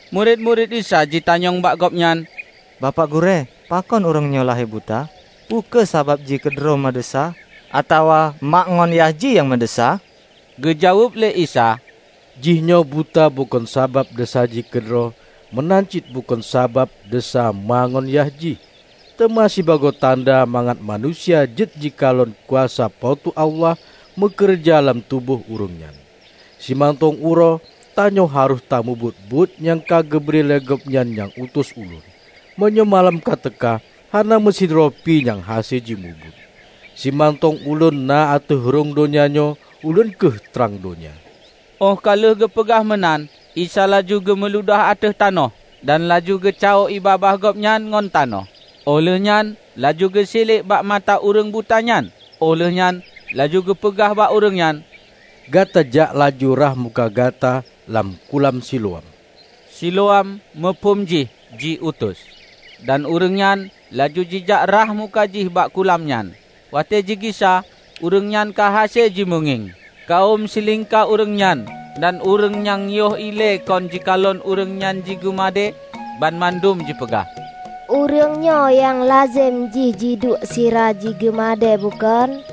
Murit-murit Isa jitanyong bak Gobnyan, "Bapak Gurée, pakon ureuëng nyoe lahé buta? Peu kheueh sabab jih keudroe meudesya atawa ma ngon yah jih nyang meudesya?" Geujaweueb lé Isa, "Jihnyoe buta bukon sabab desya jih keudroe meunan cit bukon sabab desya ma ngon yah jih, teuma sibagoe tanda mangat manusia jeuet jikalon kuasa Po teu Allah meukeureuja lam tuboh ureuëng nyan. Simantong uroe, tanyoe harôh tamubuet buet nyang ka geubri lé Gobnyan nyang utus Ulôn. Meunyoe malam ka teuka, hana meusidroe pi nyang hase jimubuet. Simantong Ulôn na ateueh rhung donya nyoe, Ulôn kheueh trang donya." Óh ka lheueh geupeugah meunan Isa laju geumuludah ateueh tanoh, dan laju geucawoe ié babah Gobnyan ngon tanoh. Óh lheuehnyan laju geusiliek bak mata ureuëng buta nyan, óh lheuehnyan laju geupeugah bak ureuëng nyan, "Gata jak laju rhah muka gata lam kulam Siloam." (Siloam muphom jih 'Jiutus'.) Dan ureuëng nyan laju jijak rhah muka jih bak kulam nyan. Watée jigisa, ureuëng nyan ka hase jimeungieng. Kawöm silingka ureuëng nyan dan ureuëng-ureuëng nyang yoh ilée kon jikalon ureuëng nyan jigeumadée, banmandum jipeugah, "Ureuëng nyoe nyang lazem jih jiduek sira jigeumadée bukon?"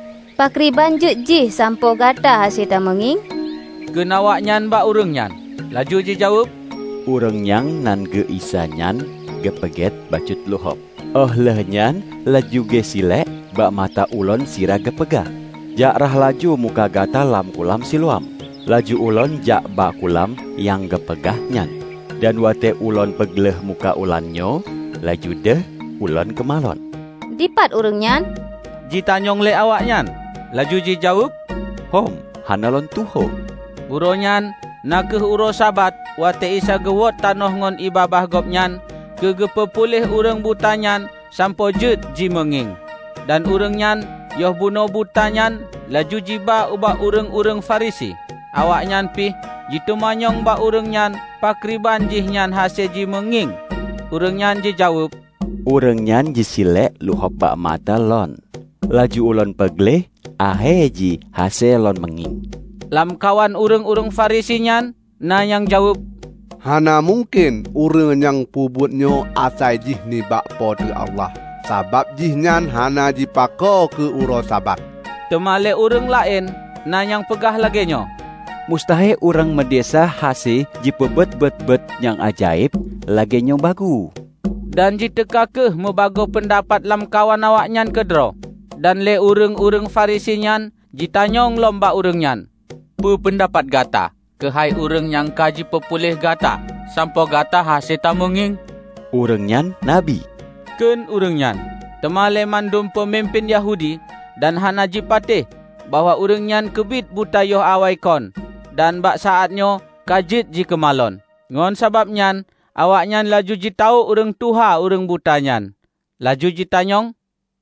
"Pakriban jeuet jih sampoe gata hase tameungieng?" kheun awaknyan bak ureuëng nyan. Laju jijaweueb, "Ureuëng nyang nan geu Isa nyan geupeugét bacut luhob, óh lheueh nyan laju geusiliek bak mata ulôn sira geupeugah, 'Jak rhah laju muka gata lam Kulam Siloam.' Laju ulôn jak bak kulam nyang geupeugah nyan. Dan watée ulôn peugleh muka ulôn nyoe, laju deuh ulôn keumalon." "Dipat ureuëng nyan?" jitanyong lé awaknyan. Laju jijaweueb, "Hôm, hana lôn tuho." Uroe nyan na kheueh uroe Sabat watée Isa geuwot tanoh ngon ié babah Gobnyan keu geupeu puléh ureuëng buta nyan sampoe jeuet jimeungieng. Dan ureuëng nyan yoh bunoe buta nyan laju jiba ubak ureuëng-ureuëng Farisi. Awaknyan pih jiteumanyong bak ureuëng nyan pakriban jihnyan hase jimeungieng. Ureuëng nyan jijaweueb, "Ureuëng nyan jisiliek luhob bak mata lôn, laju ulôn peugleh akhé jih hase lôn meungieng." Lamkawan ureuëng-ureuëng Farisi nyan na nyang jaweueb, "Hana mungken ureuëng nyang peubuetnyoe asai jih nibak Po teu Allah, sabab jihnyan hana jipako keu uroe Sabat." Teuma lé ureuëng laén na nyang peugah lagée nyoe, "Mustahe ureuëng meudesya hase jipeubuet buet-buet nyang ajaéb lagée nyoe bagoe?" Dan jiteuka kheueh mubagoe peundapat lam kawan awaknyan keudroe. Dan lé ureuëng-ureuëng Farisi nyan jitanyong lom bak ureuëng nyan, "Peue peundapat gata keuhai ureuëng nyang ka jipeupuléh gata sampoe gata hase tameungieng?" "Ureuëng nyan Nabi," kheun ureuëng nyan. Teuma lé mandum peumimpén Yahudi dan hana jipatéh bahwa ureuëng nyan keubiet buta yoh awaikon dan bak saát nyoe ka jeuet jikeumalon. Ngon sabab nyan awaknyan laju jitawök ureuëng tuha ureuëng buta nyan, laju jitanyong,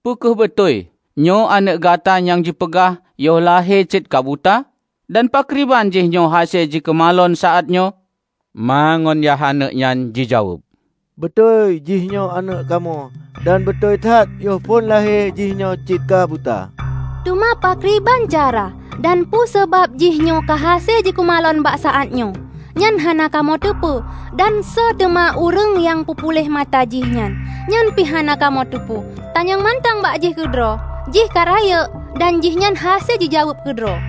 "Peu kheueh beutôi nyoe aneuëk gata nyang jipeugah yoh lahé cit ka buta? Dan pakriban jihnyoe hase jikeumalon saát nyoe?" Ma ngon yah aneuëk nyan jijaweueb, "Beutôi jihnyoe aneuëk kamoe, dan beutôi that yoh phon lahé jihnyoe cit ka buta. Teuma pakriban cara dan peue sabab jihnyoe ka hase jikeumalon bak saát nyoe, nyan hana kamoe teupeue. Dan soe teuma ureuëng nyang peupuléh mata jih nyan, nyang pih hana kamoe teupeue. Tanyong mantong bak jih keudroe, jih ka rayeuk, dan jihnyan hase jijaweueb keudroe."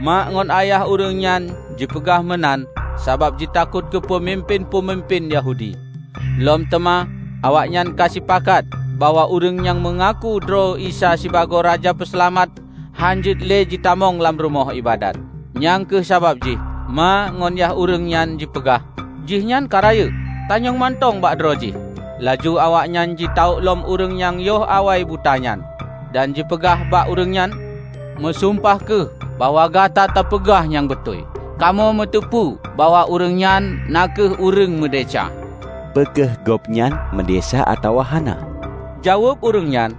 Mak ngon ayah ureuëng nyan jipeugah meunan sabab jitakot keu peumimpén-peumimpén Yahudi; lom teuma awaknyan ka sipakat, bahwa ureuëng nyang meungaku droe Isa sibagoe Raja Peuseulamat, hán jeuet le jitamong lam Rumoh Iébadat. Nyang kheueh sabab jih ma ngon yah ureuëng nyan jipeugah, "Jihnyan ka rayeuk; tanyong mantong bak droe jih." Laju awaknyan jitawök lom ureuëng nyang yoh awai buta nyan, dan jipeugah bak ureuëng nyan, "Meusumpah kheueh bahwa gata tapeugah nyang beutôi. Kamoe muteupeu bahwa ureuëng nyan na kheueh ureuëng meudesya." "Peu kheueh Gobnyan meudesya atawa hana," jaweueb ureuëng nyan,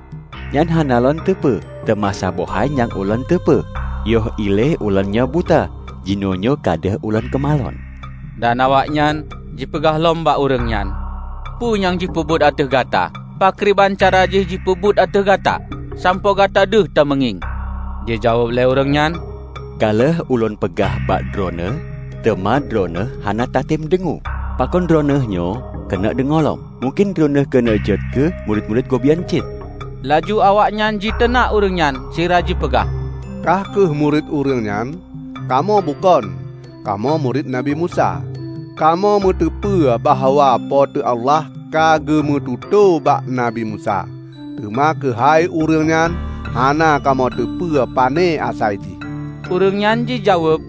"nyan hana lôn teupeu, teuma saboh hai nyang ulôn teupeu; yoh ilée ulôn nyoe buta, jinoenyoe ka deuh ulôn keumalon." Dan awaknyan jipeugah lom bak ureuëng nyan, "Peue nyang jipeubuet ateueh gata? Pakriban cara jih jipeubuet ateueh gata sampoe gata deuh tameungieng?" Jijaweueb lé ureuëng nyan, "Ka lheueh ulôn peugah bak droeneueh, teuma droeneueh hana tatem deungoe. Pakon droeneuehnyoe keuneuk deungoe lom? Mungken droeneueh keuneuk jeuet keu murit-murit Gobnyan cit?" Laju awaknyan jiteunak ureuëng nyan sira jipeugah, "Kah kheueh murit ureuëng nyan; kamoe bukon, kamoe murit Nabi Musa. Kamoe meuteupeue bahwa Po teu Allah ka geumeututoe bak Nabi Musa, teuma keuhai ureuëng nyan, hana kamoe teupeu pane asai jih." Ureuëng nyan jijaweueb,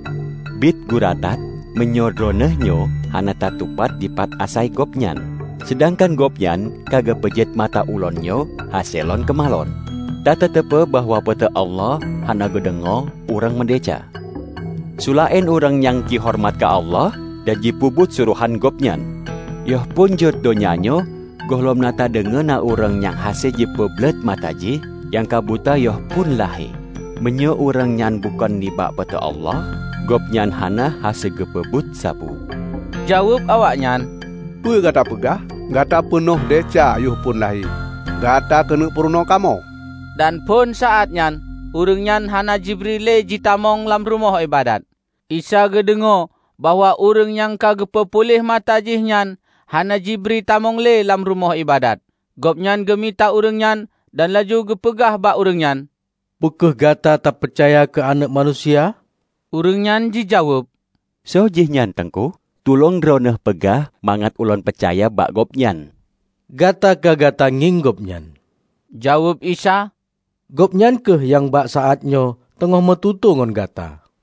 "Bit gura that meunyoe droeneueh nyoe hana tatupat dipat asai Gobnyan, seudangkan Gobnyan ka geupeujeuet mata ulôn nyoe hase lôn keumalon. Tatateupeu bahwa Po teu Allah hana geudeungoe ureuëng meudesya, seulaén ureuëng nyang jihoreumat keu Allah, dan jipeubuet surohan Gobnyan. Yoh phon jeuet donya nyoe gohlom na tadeungoe na ureuëng nyang hase jipeubleuet mata jih nyang ka buta yoh phon lahé. Meunyoe ureuëng nyan bukon nibak Po teu Allah, gobnyan hana hase geupeubuet sapeue." Jaweueb awaknyan, "Peue gata peugah? Gata peunoh desya yoh phon lahé, gata keuneuk purunoe kamoe?" Dan phon saát nyan ureuëng nyan hana jibri le jitamong lam Rumoh Iébadat. Isa geudeungoe bahwa ureuëng nyang ka geupeu puléh mata jih nyan hana jibri tamong le lam Rumoh Iébadat. Gobnyan geumita ureuëng nyan dan laju geupeugah bak ureuëng nyan, "Peu kheueh gata tapeucaya keu Aneuëk Manusia?" Ureuëng nyan jijaweueb, "Soe jih nyan, Teungku? Tulông Droeneueh peugah mangat ulôn peucaya bak Gobnyan." "Gata ka gata ngieng Gobnyan," jaweueb Isa, "Gobnyan kheueh nyang bak saát nyoe teungoh meututoe ngon gata."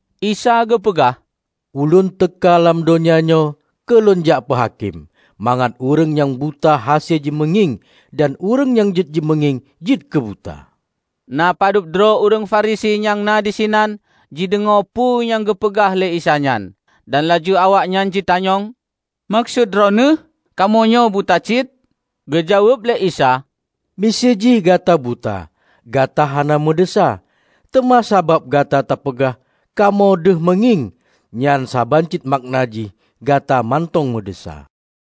Isa geupeugah, "Ulôn teuka lam donya nyoe keu Lôn jak peuhakém; mangat ureuëng nyang buta hase jimeungieng, dan ureuëng nyang jeuet jimeungieng, jeuet keu buta." Na padub droe ureuëng Farisi nyang na disinan jideungoe peue nyang geupeugah lé Isa nyan, dan laju awaknyan jitanyong, "Meukeusut Droeneueh, kamoe nyoe buta cit?" Geujaweueb lé Isa, "Miseue jih gata buta, gata hana meudesya. Teuma sabab gata tapeugah, 'Kamoe deuh meungieng,' nyan saban cit makna jih gata mantong meudesya."